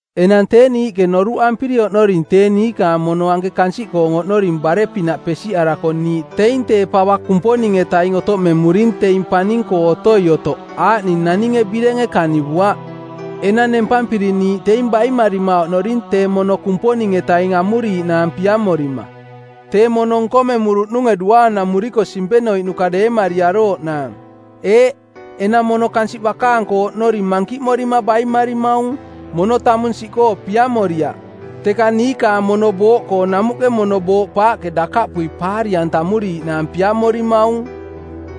Enang tee niiꞌke noruꞌampiri oꞌnoring tee niikaang mono anke kansiꞌkoo oꞌnoring bare-pinaꞌ pesiꞌarako niiꞌ teing tee pava Kumponing-etaing otoꞌmemuring teing paning-koo otoi otoꞌ aaꞌning naninge birenge kanivuaꞌ. Enang nempampiri niiꞌ teing baimarima oꞌnoring tee mono Kumponing-etaing amuriiꞌnaang piamorima, tee mono nkomemuruꞌnunge duaanamuriko simpenoiꞌnuka deemariarooꞌnaang. Eeꞌ, enang mono kansiꞌ bakaang-koo oꞌnori mankiꞌmorima baimarimaung. Mono tamung siꞌkoo piamoriaꞌ, teka niikaang mono booꞌkoong namuꞌke mono booꞌpaaꞌke dakaꞌpui paari-antamuriiꞌnaang piamorimaung.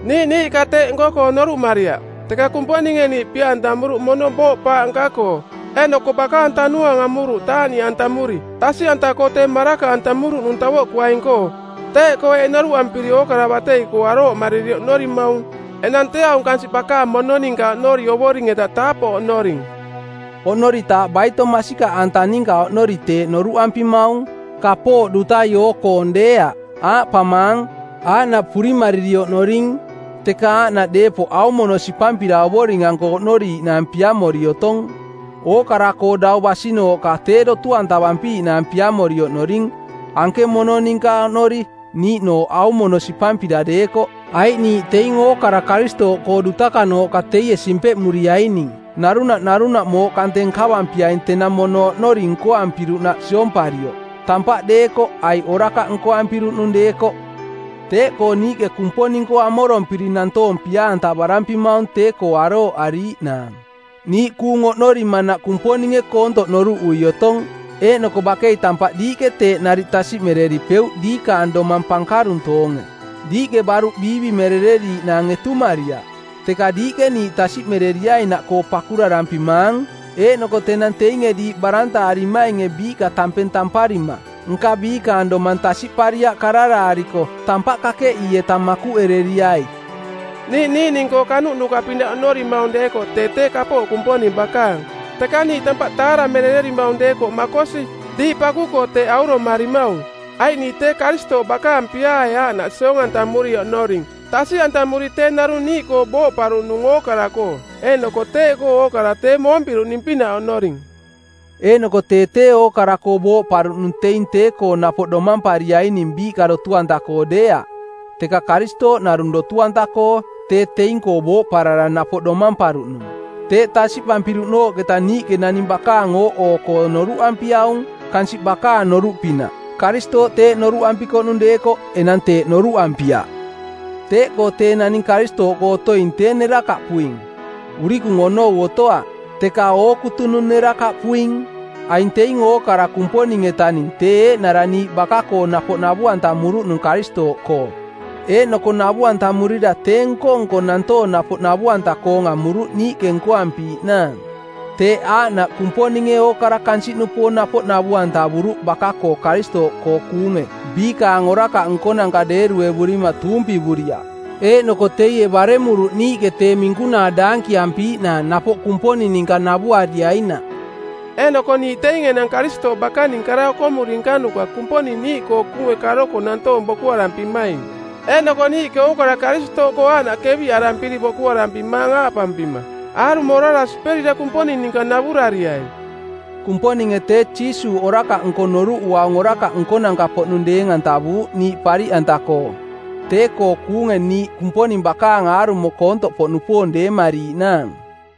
Niiꞌ niiꞌka teeꞌ nko-koo noruꞌmariaꞌ, teka Kumponinge niiꞌ pia-antamuruꞌ mono booꞌpaaꞌ nka-koo, eeꞌnoko bakaang Tanuaang amuruꞌ taaꞌniꞌantamuri, tasiꞌanta-koo tee maraka-antamuruꞌnung tavoꞌkuaing-koo. Teeꞌkoo eeꞌ noruꞌampiri ookara batei-koo arooꞌmariri oꞌnorimaung: Enang tee aung kansiꞌ bakaang mono ninka oꞌnori Ovoring-eta taapoꞌ oꞌnoring. Oꞌnoritaaꞌ baitoi masikaꞌanta ninka oꞌnori teeꞌ noruꞌampimaung, kapooꞌ dutai oo-koong deeaꞌ. Aaꞌpamaang, aaꞌnaꞌ purimariri oꞌnoring, teka aaꞌnaꞌ deepoꞌ aung mono sipampira Ovoring-anko oꞌnoriiꞌnaang piamori otong. Ookara-koo dau basinooꞌka tee dotu-antavampiiꞌnaang piamori oꞌnoring, anke mono ninka oꞌnori, niiꞌnooꞌ aung mono sipampira deekoꞌ. Aiꞌ niiꞌ teing ookara Karistooꞌkoo dutakanooꞌka teie simpeꞌmuriaining, narunaꞌ narunaꞌ mooꞌ kante nkavampiaing tenang mono-koo oꞌnori nkoampiruꞌnaꞌ siomparioꞌ, tampaꞌ deekoꞌ aiꞌ orakaꞌ nkoampiruꞌnung deekoꞌ. Teeꞌkoo niiꞌke Kumponing-koo amorompiri nantoong pia-antavarampimaung tee-koo arooꞌariiꞌnaang. Niiꞌ kuung oꞌnorimanaꞌ Kumponinge koontoꞌ noruꞌui otong, eeꞌnoko bakei tampaꞌ diiꞌke teeꞌ nariꞌ tasiꞌmereripeuꞌ diikaang domang pankaruntoonge. Diiꞌke baruꞌ biivimerereriiꞌnaang etumariaꞌ, teka diiꞌke niiꞌ tasiꞌmereriainaꞌkoo pakurarampimaang, eeꞌnoko tenang teinge diiꞌ barantaarimainge biiꞌka tampeng tamparima nka biikaang domang tasiꞌpariaꞌ kararaariko, tampaꞌ kakeꞌii-eta makuꞌereriai. Niiꞌ niiꞌning-koo kanuꞌnuka-pinaꞌ auromarimaung deekoꞌ tee tee kapooꞌ Kumponing bakaang, teka niiꞌ tampaꞌ taaramerererimaung deekoꞌ makosi, diiꞌ paku-koo teeꞌ auromarimaung. Aiꞌ niiꞌ tee Karistooꞌ bakaang piaae aaꞌnaꞌ siong-antamuri oꞌnoring tasiꞌantamuri tee narung niiꞌkoo booꞌparuꞌnung ookara-koo, eeꞌnoko teeꞌkoo ookara tee moompiruꞌning-pinaꞌ oꞌnoring. Eeꞌnoko tee tee ookara-koo booꞌparuꞌnung teing tee-koo napoꞌ domampariaining biiꞌka dotu-anta-koo deeaꞌ, teka Karistooꞌ narung dotu-anta-koo, tee teing-koo booꞌparara napoꞌ domamparuꞌnung. Teeꞌ tasiꞌpampiruꞌnooꞌketa niiꞌke naning bakaang ooꞌoo-koo noruꞌampiaung, kansiꞌ bakaang noruꞌpinaꞌ. Karistooꞌ teeꞌ noruꞌampikoꞌnung deekoꞌ enang teeꞌ noruꞌampiaꞌ. Teeꞌkoo tee naning Karistooꞌkoo otoing tee nerakaꞌpuing. Urikung onou otoaꞌ, teka ookutunung nerakaꞌpuing. Aing teing ookara Kumponing-etaning tee eeꞌnara niiꞌ baka-koo napoꞌ navu-antamuruꞌnung Karistooꞌkoo, eeꞌnoko navu-antamurira tee nko-nko nantoong napoꞌ navu-anta-koong amuruꞌ niiꞌke nkoampiiꞌnaang. Teeꞌ aaꞌnaꞌ Kumponinge ookara kansiꞌnupoong napoꞌ navu-antavuruꞌ baka-koo Karistooꞌkoo kuunge biikaang orakaꞌ nkonanka deeruevurima tuumpivuriaꞌ. Eeꞌnoko teie baremuruꞌ niiꞌke tee minkunaa daankiampiiꞌnaang napoꞌ Kumponing ninka navuariainaꞌ. Eeꞌnoko niiꞌ teing enang Karistooꞌ bakaning kara okomuri nkanuka Kumponing niiꞌkoo kuunge karoko nantoong bokuarampimaing, eeꞌnoko niiꞌke ookara Karistooꞌkoo aaꞌnaꞌ keviꞌarampiri bokuarampimaang aaꞌpampima: Aarumo orara siperira Kumponing ninka navurariai. Kumponinge tee Jiisuuꞌ orakaꞌnko noruꞌuaung orakaꞌ nkonanka-poꞌnung deeng-antavuuꞌ niiꞌ pariꞌanta-koo, tee-koo kuunge niiꞌ Kumponing bakaang aarumo koontoꞌpoꞌnupoong deemariiꞌnaang.